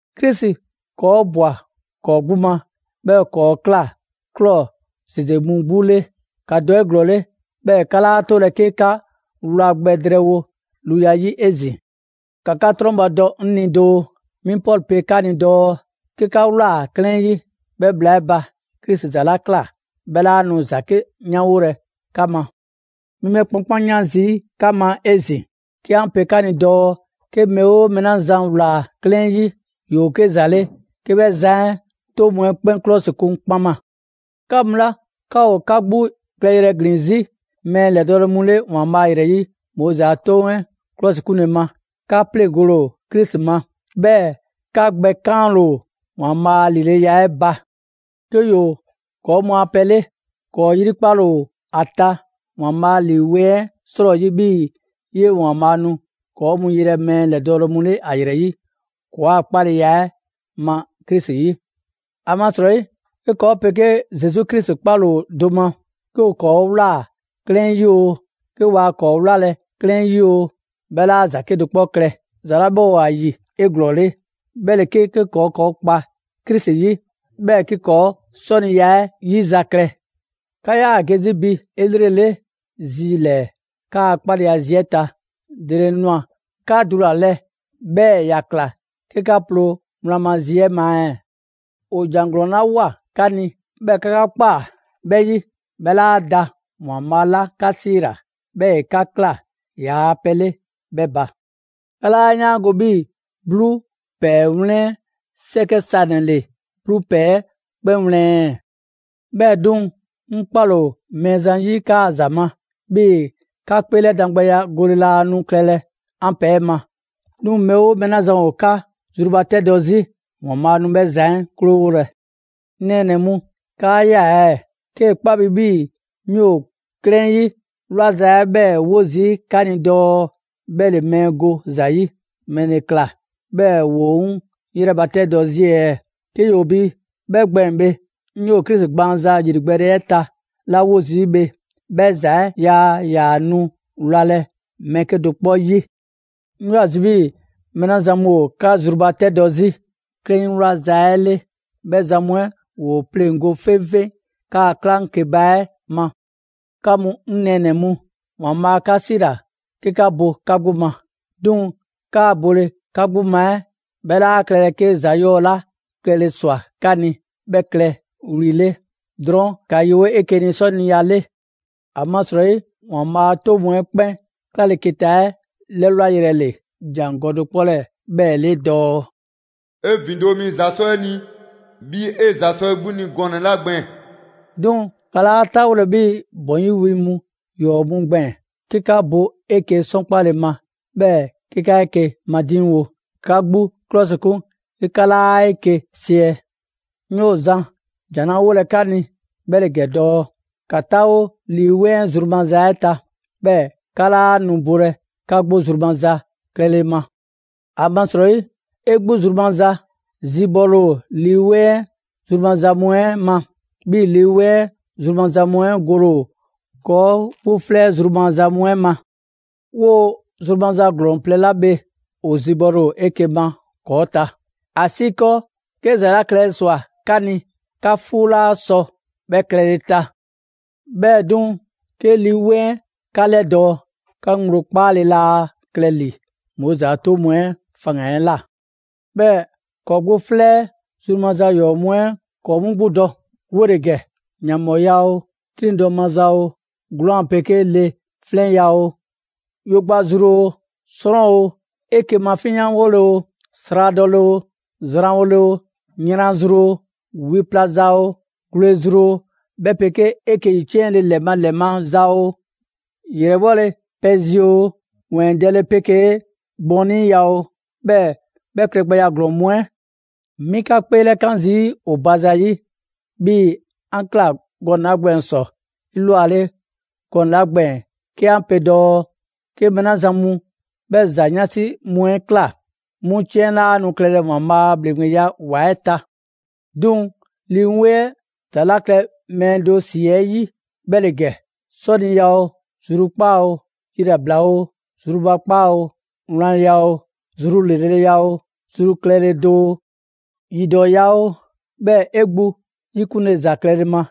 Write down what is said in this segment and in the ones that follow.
Krisi ‑kɔɔ' ‑bwa ‑kɔɔ' 'gbu ma, 'bhɛɛ‑ ‑kɔɔ' ꞊kla ꞊klɔ ‑zeze mu 'gbu 'le. ‑Ka dɔ 'eglɔɔle, 'bhɛɛ‑ 'ka 'laa 'tolɛ‑ 'ke 'ka 'wla gbɛ drɛɛwo luya 'yi 'ezin‑. ‑Ka 'ka 'trɔnbadɔ 'ŋ ni doo! 'Mi Pɔlu pe 'ka ni dɔɔ: «'Ke 'ka ꞊wlaa 'klɛɛn 'yi, 'bhɛ bhla 'ɛ ba, Krisi ‑za 'la ꞊kla, 'bhɛ 'laa nu ‑za 'ke 'yanwolɛ 'ka ma». 'Mi 'bhɛ 'kpankpanyan 'zi 'ka ma 'ezin‑, 'ke 'an pe 'ka ni dɔɔ 'ke mɛɛ 'oo mɛɛ 'la zan ‑wlaa 'klɛɛn 'yi, ‑yoo 'ke ‑za 'le 'ke 'bhɛ zan 'ɛ 'toŋ mu 'ɛ 'kpɛn 'klɔsikun kpaŋma. 'Ka mu 'la 'ka ‑o 'ka 'gbu klɛyrɛ ‑glin zi' mɛɛ ‑lɛdɔɔle mu 'le ‑Waanbhaa' ‑yrɛ 'yi Moizi a 'toŋ 'ɛ ‑klɔsikunle ma, 'ka 'pleŋgole ‑o Krisi ma. 'Bhɛɛ‑ 'ka gbɛ 'kaanle‑ ‑o ‑Waanbhaa' a ‑lileya 'ɛ ba. 'Ke ‑yoo ‑kɔɔ' mu a pɛ 'le, ‑kɔɔ' 'yrikpale ‑o ‑a ta ‑Waanbhaa' Lii 'Weŋ 'ɛ 'srɔyi 'bhii‑ 'yee‑ ‑Waanbhaa' nu ‑kɔɔ' mu 'yelɛ‑ mɛɛ ‑lɛdɔɔle mu 'le ‑ ‑a ‑yrɛ 'yi, ‑kɔɔa' 'kpaleya 'ɛ ma Krisi 'yi. ‑Amasrɔyi, 'ke ‑kɔɔ' 'pegee Zesu Krisi 'kpale‑ ‑o do ma, 'ke ‑o ‑kɔɔ' ꞊wlaa 'klɛɛn 'yi oo, 'ke waa ‑kɔɔ' 'wlalɛ‑ 'klɛɛn 'yi oo, 'bhɛ 'laa ‑za 'kedo‑ 'kpɔ klɛ. ‑Za 'la 'bhɛ ‑o ‑a ‑yi 'eglɔɔle, 'bhɛ ‑le 'ke ‑kɔɔ' ‑kɔɔ' kpa Krisi 'yi, 'bhɛɛ‑ 'ke ‑kɔɔ' 'sɔniya 'ɛ 'yizaklɛ. 'Ka 'yaa‑ ge 'zi bi 'elrele zi ‑lɛɛ 'kaa‑ 'kpaleya zi 'ɛ ta. ‑Dele ꞊nwa 'ka dulalɛ, 'bhɛɛ‑ ‑ya ꞊kla 'ke 'ka ploo wlan ma zi 'ɛ ma ɛɛ? ‑O ‑jan ‑glɔɔn 'la ꞊woa 'ka ni, 'bhɛɛ‑ 'ka 'ka ꞊kpaa 'bhɛ 'yi, 'bhɛ laa da ‑Waanbhaa' 'la 'ka 'siila‑, 'bhɛɛ‑ ‑e 'ka ꞊kla ‑yaa pɛ 'le 'bhɛ ba. 'Ka 'laa 'yaango‑ 'bhii‑ 'bluu ‑pɛɛ 'wlɛn 'sɛkɛ sanɛ‑ ‑le 'bluu ‑pɛɛ 'ɛ 'kpɛn wlɛn ɛɛ? 'Bhɛɛ‑ 'duŋ‑, 'ŋ 'kpale‑ ‑o Mɛɛzan 'yi 'kaa‑ ‑za ma, 'bhii‑ 'ka 'kpeelɛdangbɛya gole laa nu klɛlɛ 'an pɛ 'ɛ ma. 'Duŋ‑, mɛɛ 'oo mɛɛ 'la zan ‑o 'ka zrubatɛdɔ 'zi, ‑Waanbhaa' nu 'bhɛ zan 'ɛ 'krowolɛ. 'Ŋ nɛɛnɛ‑ mu, 'kaa ꞊ya ɛɛ? 'Kee‑ 'kpa bi 'bhii‑ 'mi ‑o 'klɛɛn 'yi 'wlaza 'ɛ 'bhɛɛ‑ 'wo zii' bi dɔɔ 'bhɛ ‑le mɛɛ go ‑za 'yi, ‑mɛle ꞊kla 'bhɛɛ‑ ‑woo 'ŋ 'yrɛbatɛdɔ 'zi ɛɛ? 'Ke ‑yoo bi 'bhɛ gbɛɛn‑ bhe, 'ŋ 'yoo‑ Krisi gbaanza ‑yrigbɛɛle 'ɛ ta 'la 'wo zii' bhe, 'bhɛ ‑za 'ɛ yaa ‑yaa nu wlalɛ‑ mɛɛ 'kedo‑ 'kpɔ 'yi. 'Ŋ 'yoo‑ ‑a zi' 'bhii‑ mɛɛ 'la zan mu ‑o 'ka zrubatɛdɔ 'zi 'klɛɛn 'yi 'wlaza‑ 'ɛ 'le, 'bhɛ zan mu 'ɛ ‑woo 'pleŋgo‑ 'feŋfeŋ 'kaa‑ 'klaŋkeba 'ɛ ma. 'Ka mu 'ŋ nɛɛnɛ‑ mu, ‑Waanbhaa' 'ka 'siila‑ 'ke 'ka bo 'ka 'gbu ma. 'Duŋ‑ 'kaa bole 'ka 'gbu ma 'ɛ 'bhɛ 'laa klɛlɛ 'ke ‑za ‑yɔɔ' 'la klɛle ꞊swa 'ka ni 'bhɛ klɛ wli 'le. Drɔɔn' ‑ka yewo 'eke‑ ni 'sɔniya 'le. ‑Amasrɔyi ‑Waanbhaa' a 'toŋ mu 'ɛ 'kpɛn 'klaleketa 'ɛ 'lɛwlayrɛ ‑le ‑jangɔ' do 'kpɔ 'lɛɛ‑ 'bhɛɛ‑ 'le dɔɔ: «'E ‑vindo' mi ‑za 'sɔ 'e ni 'bhii‑ 'e ‑za sɔ 'e 'gbu ni gɔnɛ‑ 'la gbɛɛn‑.» 'Duŋ‑, 'ka 'laa 'taawolɛ 'bhii‑ ‑bɔn 'yi wi ‑yɔɔ' mu gbɛɛn‑, 'ke 'ka bo 'eke‑ 'sɔnkpale ma, 'bhɛɛ‑ 'ke 'ka 'eke‑ madiŋwo. 'Ka 'ka 'gbu 'klɔsikun 'ke 'ka 'laa 'eke‑ siɛ. 'Ŋ 'yoo‑ zan ‑jan 'la 'wolɛ‑ 'ka ni, 'bhɛ ‑le ‑gɛ dɔɔ: ‑Ka 'taawo Lii 'Weŋ 'ɛ zru maza 'ɛ ta, 'bhɛɛ‑ 'ka 'laa nu bolɛ 'ka 'gbu zru maza klɛle ma. ‑Amasrɔyi 'e 'gbu zru maza zibɔle ‑o Lii 'Weŋ 'ɛ zru maza mu 'ɛ ma. 'Bhɛɛ‑ Lii 'Weŋ 'ɛ zru maza mu 'ɛ gole ‑o ‑kɔɔ' 'gbu 'flɛ 'ɛ zru maza mu 'ɛ ma. 'Woo‑ zru maza ‑glɔɔn plɛ 'la bhe ‑o zibɔle ‑o 'eke‑ ma ‑kɔɔ' ta, ‑asiikɔɔ 'ke ‑za 'la klɛle ꞊swa 'ka ni 'ka 'fuu 'laa sɔ 'bhɛ klɛle‑ ta. 'Bhɛɛ‑ 'duŋ‑, 'ke Lii 'Weŋ 'ɛ 'ka 'lɛdɔɔ‑, 'ka ŋgblo 'kpaale‑ laa klɛ ‑li Moizi a 'toŋ mu 'ɛ faŋgan‑ 'ɛ ꞊la. 'Bhɛɛ‑ ‑kɔɔ' 'gbu 'flɛ 'ɛ zru maza ‑yɔɔ' mu 'ɛ ‑kɔɔ' 'mu 'gbu dɔ, 'wole‑ ‑gɛ: ‑yanbhɔɔya oo, 'triŋdɔ‑ maza oo, 'gwlaan‑ 'pegee le 'flɛnya‑ oo, yo gba zru oo, 'srɔn oo, 'eke‑ mafinyanwole oo, sradɔle oo, zranwole oo, yran zru oo, wi pla za oo, gwle zru oo, 'bhɛ 'pegee 'eke‑ ‑yiciɛnle ‑lɛ ma ‑lɛ ma ‑za oo; ‑yrɛbhɔle pɛ zi oo, ‑wɛɛndɛle 'pegee gbɔniiya oo, 'bhɛɛ‑ 'bhɛ klɛgbɛya ‑glɔɔn mu 'ɛ. 'Mi 'ka 'kpeelɛkan zii' ‑o ba zayi', 'bhii‑ 'an ꞊kla gban ‑sɔ 'elwale gɔnɛ‑ 'la gbɛɛn‑ 'ke 'an pe dɔɔ: 'Ke mɛɛ 'la zan mu 'bhɛ ‑za 'yansi mu 'ɛ klɛ, 'mu 'ciɛn 'laa nu klɛlɛ ‑Waanbhaa' a ‑bhleŋgbeya ‑wa 'ɛ ta. 'Duŋ‑, Lii 'Weŋ 'ɛ ‑za 'la klɛ mɛɛ do ‑si 'ɛ 'yi 'bhɛ ‑le ‑gɛ: 'Sɔniya oo, zrukpaa' oo, yilabla oo, zrubakpaa oo, wlanya oo, zru ‑lreleya oo, zru klɛle do oo, yidɔɔya oo, 'bhɛɛ‑ 'e 'gbu 'yikunle ‑za klɛle ma.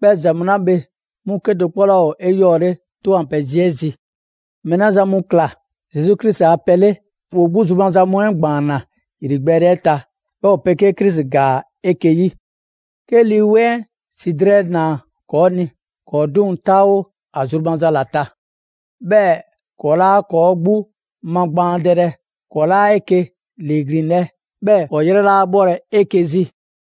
'Bhɛ ‑za mu 'la bhe, 'mu 'kedo‑ 'kpɔ 'laa ‑o 'eyɔɔle 'Toŋ a pɛ zi 'ɛ zi. Mɛɛ 'la zan mu ꞊kla Zesu Krisi a pɛ 'le, ‑woo 'gbu zru maza mu 'ɛ ‑gbaanna ‑yrigbɛɛle 'ɛ ta, 'bhɛɛ‑ ‑o 'pegee Krisi ‑gaa 'eke‑ 'yi. 'Ke Lii 'Weŋ 'ɛ ‑si drɛɛ ꞊naa ‑kɔɔ' ni, ‑kɔɔ' 'duŋ‑ 'taawo ‑a zru maza ‑la ta. 'Bhɛɛ‑ ‑kɔɔ' 'laa ‑kɔɔ' 'gbu magbaandɛlɛ, ‑kɔɔ' 'laa 'eke‑ ‑liiglinlɛ, 'bhɛɛ‑ ‑kɔɔ' 'yrɛ 'laa 'bhɔlɛ‑ 'eke‑ zi.